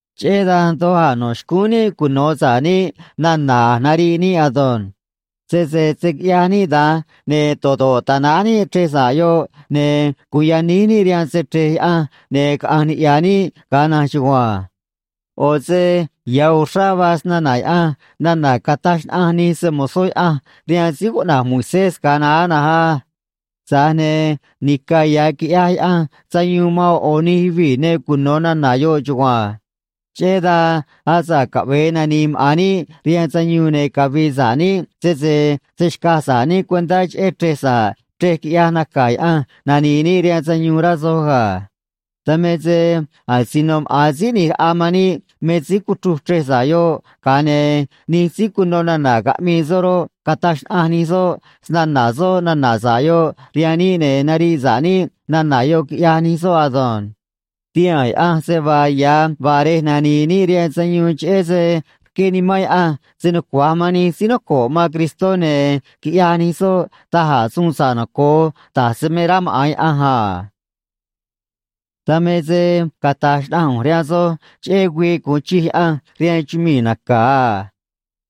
Cheꞌé dan doj a̱ nó xcúún níꞌ cuno̱ sa̱ꞌ níꞌ nana̱ a̱j nariꞌ níꞌ ado̱nj. Sese se̱ quiꞌyaj níꞌ da̱nj, ne̱ do̱ꞌ do̱ꞌ ta̱náj níꞌ chrej sa̱ꞌ yoꞌ, ne̱ gu̱un yaníj níꞌ rihaan se‑chre̱j Yaꞌanj, ne̱ caꞌa̱nj niꞌya̱ níꞌ ga̱a na̱nj chugua̱nj. ꞌO̱ se ya̱ uxrá vaa snana̱ Yaꞌanj nana̱ cataj xnaꞌanj nij se‑mo̱zó Yaꞌanj rihaan síí cuꞌna̱j Moisés ga̱a naá na̱nj á. Tza̱j ne̱ nica̱ ya̱ quiꞌyaj Yaꞌanj sayuun man ꞌo̱ ꞌo̱ nij yuvii̱ ne cuno̱ nana̱ yoꞌ chugua̱nj. Cheꞌé dan, asa̱ꞌ caꞌve̱e nani̱i̱ maꞌa̱n níꞌ rihaan sayuun ne̱ cavi̱i̱ sa̱ꞌ níꞌ, sese se̱ xcaj sa̱ꞌ níꞌ cuentá cheꞌé chrej sa̱ꞌ chrej quiꞌyaj naca̱ Yaꞌanj nani̱i̱ níꞌ rihaan sayuun, rá soj ga̱. Dan me se asino maꞌa̱n Síí ꞌNi̱j Raꞌa man níꞌ me síí cuchruj chrej sa̱ꞌ yoꞌ, ga̱a ne̱ nij síí cuno nana̱ caꞌmii soꞌ roꞌ, cataj xnaꞌanj nij soꞌ snana̱ soꞌ nana̱ sa̱ꞌ yoꞌ rihaan níꞌ, ne̱ nariꞌ sa̱ꞌ níꞌ nana̱ yoꞌ, quiꞌyaj nij soꞌ ado̱nj. Tihaa̱n Yaꞌanj se vaa ya̱ vaa rej nani̱i̱ níꞌ rihaan sayuun cheꞌé se rqué Nimán Yaꞌanj se nucua̱j man nij síí noco̱ꞌ man Cristó, ne̱ quiꞌyaj nij soꞌ da̱j a̱ suun sa̱ꞌ noco̱o, da̱j se me rá maꞌa̱n Yaꞌanj a. Dan me se cata̱j xnaꞌanj ꞌu̱nj rihaan soj cheꞌé güii gu̱un chij Yaꞌanj rihaan chumii̱ naca̱ a.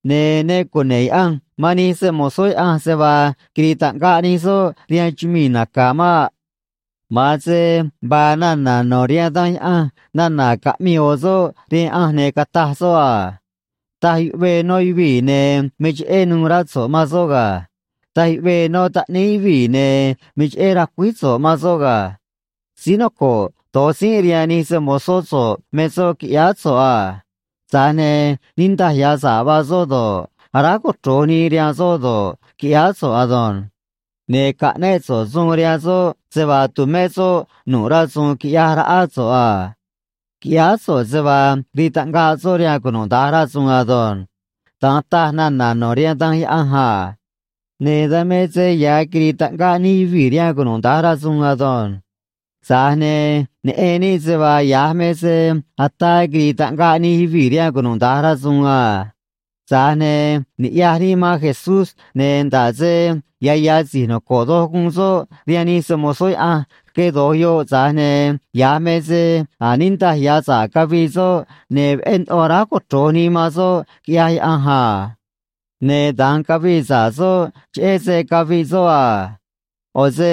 Ne̱ ne cune̱ꞌ Yaꞌanj man nij se‑mo̱zó Yaꞌanj se vaa quiri̱i̱ taꞌngaꞌ nij soꞌ rihaan chumii̱ naca̱ maꞌ. Ma̱an se vaa nana̱ no̱ rihaan Danj Yaꞌanj nana̱ caꞌmii ꞌo̱ soꞌ rihaan Yaꞌanj, ne̱ cataj soꞌ a: Taj yuꞌvee nó yuvii̱, ne̱ me cheꞌé nuû rá so̱ꞌ man soꞌ ga̱. Taj yuꞌvee nó taꞌníí yuvii̱, ne̱ me cheꞌé racuíj so̱ꞌ man soꞌ ga̱. Síí noco̱ꞌ do̱j tzínꞌ rihaan nij se‑mo̱zó so̱ꞌ me soꞌ, quiꞌyáá so̱ꞌ a. Tza̱j ne̱ niꞌndaj ya̱ sa̱ꞌ vaa soꞌ do̱ꞌ, aráj cochro̱j nii rihaan soꞌ do̱ꞌ, quiꞌyáá so̱ꞌ ado̱nj. Ne̱ caꞌnéꞌ so̱ꞌ suun rihaan soꞌ se vaa tu̱mé soꞌ nu̱ꞌ rasu̱u̱n quiꞌyaj raꞌá so̱ꞌ a. Quiꞌyáá so̱ꞌ se vaa rii taꞌngaꞌ soꞌ rihaan cunuda̱nj rasu̱u̱n ado̱nj. Da̱nj taj nana̱ no̱ rihaan Danj Yaꞌanj a. Ne̱ dan me se ya̱ quiri̱i̱ taꞌngaꞌ nij yuvii̱ rihaan cunuda̱nj rasu̱u̱n ado̱nj. Tza̱j ne̱ neꞌen níꞌ se vaa ya̱j me se ataa quiri̱i̱ taꞌngaꞌ nij yuvii̱ rihaan cunuda̱nj rasu̱u̱n a. Tza̱j ne̱ niꞌya̱j níꞌ man Jesús, ne̱ nda̱ꞌ se ya̱ ya̱ si̱j noco̱ꞌ doj guun soꞌ rihaan nij se‑mo̱zó Yaꞌanj rque do̱j yoꞌ, tza̱j ne̱ ya̱j me se a̱j niꞌndaj ya̱ sa̱ꞌ cavii soꞌ, ne̱ veꞌé ndoꞌo aráj cochro̱j nii man soꞌ, quiꞌyaj Yaꞌanj a. Ne̱ da̱nj cavii sa̱ꞌ soꞌ, cheꞌé se caviꞌ soꞌ a. ꞌO̱ se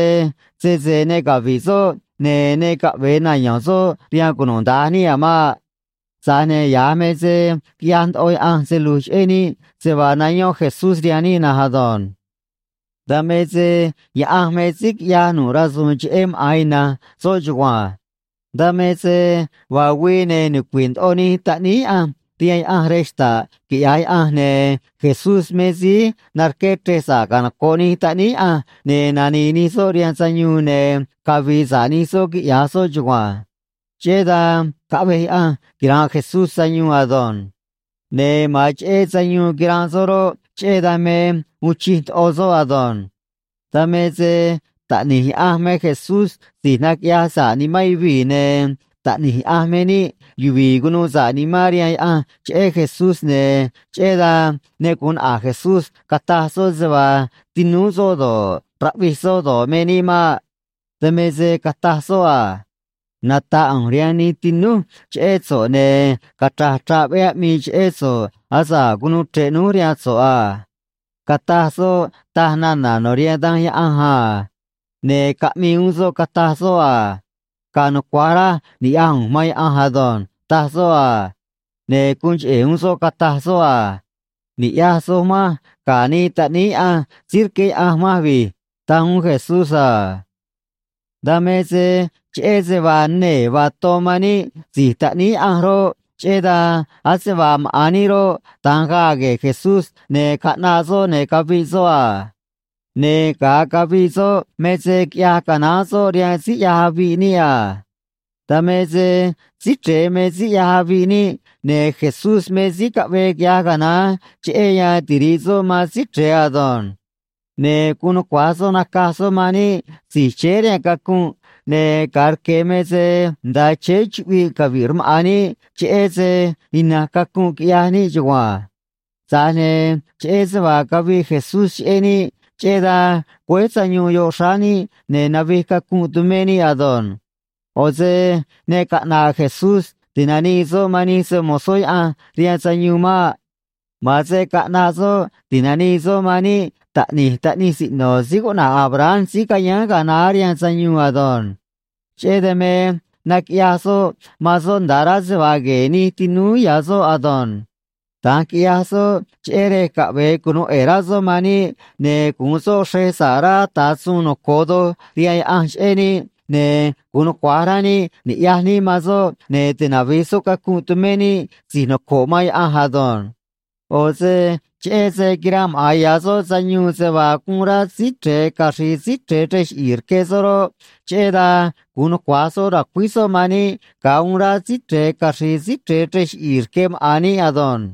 sese ne cavi̱ꞌ soꞌ, ne̱ ne caꞌve̱e nayo̱n soꞌ rihaan cunuda̱nj níꞌ a̱ maꞌ. Tza̱j ne̱ ya̱j me se quiꞌyaj ndoꞌo Yaꞌanj se lu̱j cheꞌé níꞌ se vaa nayón Jesús rihaan níꞌ na̱nj ado̱nj. Dan me se Yaꞌanj me síí quiꞌyaj nu̱ꞌ rasu̱u̱n cheꞌé maꞌa̱n ina̱nj soꞌ chugua̱nj. Dan me se vaa güii, ne̱ nucui̱ꞌ ndoꞌo nij taꞌníí Yaꞌanj rihaan Yaꞌanj rej xta̱ꞌ, quiꞌya̱j Yaꞌanj, ne̱ Jesús me síí narqué chrej sa̱ꞌ canoco̱ꞌ nij taꞌníí Yaꞌanj, ne̱ nani̱i̱ nij soꞌ rihaan sayuun, ne̱ cavi̱i̱ sa̱ꞌ nij soꞌ quiꞌya̱j soꞌ chugua̱nj. Cheꞌé dan caꞌvej Yaꞌanj quira̱nꞌ Jesús sayuun ado̱nj. Ne̱ ma̱an cheꞌé sayuun quiranꞌ soꞌ roꞌ, cheꞌé dan me uun chij ndoꞌo soꞌ ado̱nj. Dan me se Taꞌni̱j Yaꞌanj me Jesús si̱j naquiꞌyaj sa̱ꞌ nimán yuvii̱, ne̱ taꞌni̱j Yaꞌanj me níꞌ yuvi̱i̱ cunuu sa̱ꞌ nimán rihaan Yaꞌanj cheꞌé Jesús, ne̱ cheꞌé dan ne gu̱un naꞌa̱j Jesús cata̱j soꞌ se vaa tinúú soꞌ do̱ꞌ, raꞌvij soꞌ do̱ꞌ, me níꞌ maꞌ. Dan me se cataj soꞌ a: Nata̱ꞌ ꞌu̱nj rihaan nij tinúj cheꞌé so̱ꞌ, ne̱ cachra̱j chraꞌ veꞌé aꞌmii cheꞌé so̱ꞌ asa̱ꞌ cunuu chre̱ꞌ núj rihaan so̱ꞌ a, cataj soꞌ, taj nana̱ no̱ rihaan Danj Yaꞌanj a. Ne̱ caꞌmii uún soꞌ, cataj soꞌ a: Ga̱a̱ nucua̱j raj ni̱ꞌyaj ꞌu̱nj man Yaꞌanj ado̱nj, taj soꞌ a. Ne̱ guun cheꞌe̱ uún soꞌ, cataj soꞌ a: Ni̱ꞌyaj soj manj ga̱ nij taꞌníí Yaꞌanj síí rqué Yaꞌanj manj vi̱j, taj uún Jesús a. Dan me se cheꞌé se vaa nee̱ vaa ton man níꞌ si̱j taꞌníí Yaꞌanj roꞌ, cheꞌé dan ase vaa maꞌa̱n níꞌ roꞌ, da̱nj gaa gue̱e̱ Jesús, ne̱ caꞌnaꞌ soꞌ, ne̱ caviꞌ soꞌ a. Ne̱ ga̱a caviꞌ soꞌ me se quiꞌyaj canaán soꞌ rihaan síí ꞌyaj aviꞌ níꞌ a. Dan me se Síí Chre̱e me síí ꞌyaj aviꞌ níꞌ, ne̱ Jesús me síí caꞌvee quiꞌyaj canaán cheꞌé yan tiri̱ꞌ soꞌ man Síí Chre̱e ado̱nj. Ne̱ guun nucua̱j soꞌ nacaj soꞌ man níꞌ si̱j chéé rihaan cacunꞌ, ne̱ ga̱a rque̱ me se nda̱a chéé chuꞌviꞌ cavi̱ꞌ rmaꞌa̱n níꞌ cheꞌé se ina̱nj cacunꞌ quiꞌyaj níꞌ chugua̱nj. Tza̱j ne̱ cheꞌé se vaa caviꞌ Jesús cheꞌé níꞌ, cheꞌé dan güéj sayuun yoꞌ xráá níꞌ ne̱ navij cacunꞌ tumé níꞌ ado̱nj. ꞌO̱ se ne caꞌna̱ꞌ Jesús ti̱nanii soꞌ man nij se‑mo̱zó Yaꞌanj rihaan sayuun maꞌ. Ma̱an se caꞌnaꞌ soꞌ ti̱nanii soꞌ man níꞌ taꞌni̱j taꞌnij siꞌno̱ síí cuꞌna̱j Abraham síí cayáán ga̱a naá rihaan sayuun ado̱nj. Cheꞌé dan me naquiꞌyaj soꞌ man soꞌ nda̱a rá se vaa gue̱e̱ nij tinúú ya̱ soꞌ ado̱nj. Da̱nj quiꞌyaj soꞌ cheꞌé rej caꞌve̱e cunu̱u ꞌe̱e̱ rá soꞌ man níꞌ, ne̱ gu̱un soꞌ xrej sa̱ꞌ rá ata̱ suun noco̱o doj rihaan Yaꞌanj cheꞌé níꞌ, ne̱ gu̱un nucua̱j rá níꞌ ni̱ꞌyaj níꞌ man soꞌ, ne̱ tinavi̱j soꞌ cacunꞌ tumé níꞌ si̱j noco̱ꞌ man Yaꞌanj ado̱nj. ꞌO̱ se cheꞌé se quiranꞌ maꞌa̱n ya̱ soꞌ sayuun se vaa guun rá Síí Chre̱e caxri̱i̱ Síí Chre̱e chrej chiꞌi̱i̱ rque soꞌ roꞌ, cheꞌé dan gu̱un nucua̱j soꞌ ra̱cuíj soꞌ man níꞌ ga̱a uun rá Síí Chre̱e caxri̱i̱ Síí Chre̱e chrej chiꞌi̱i̱ rque maꞌa̱n níꞌ ado̱nj.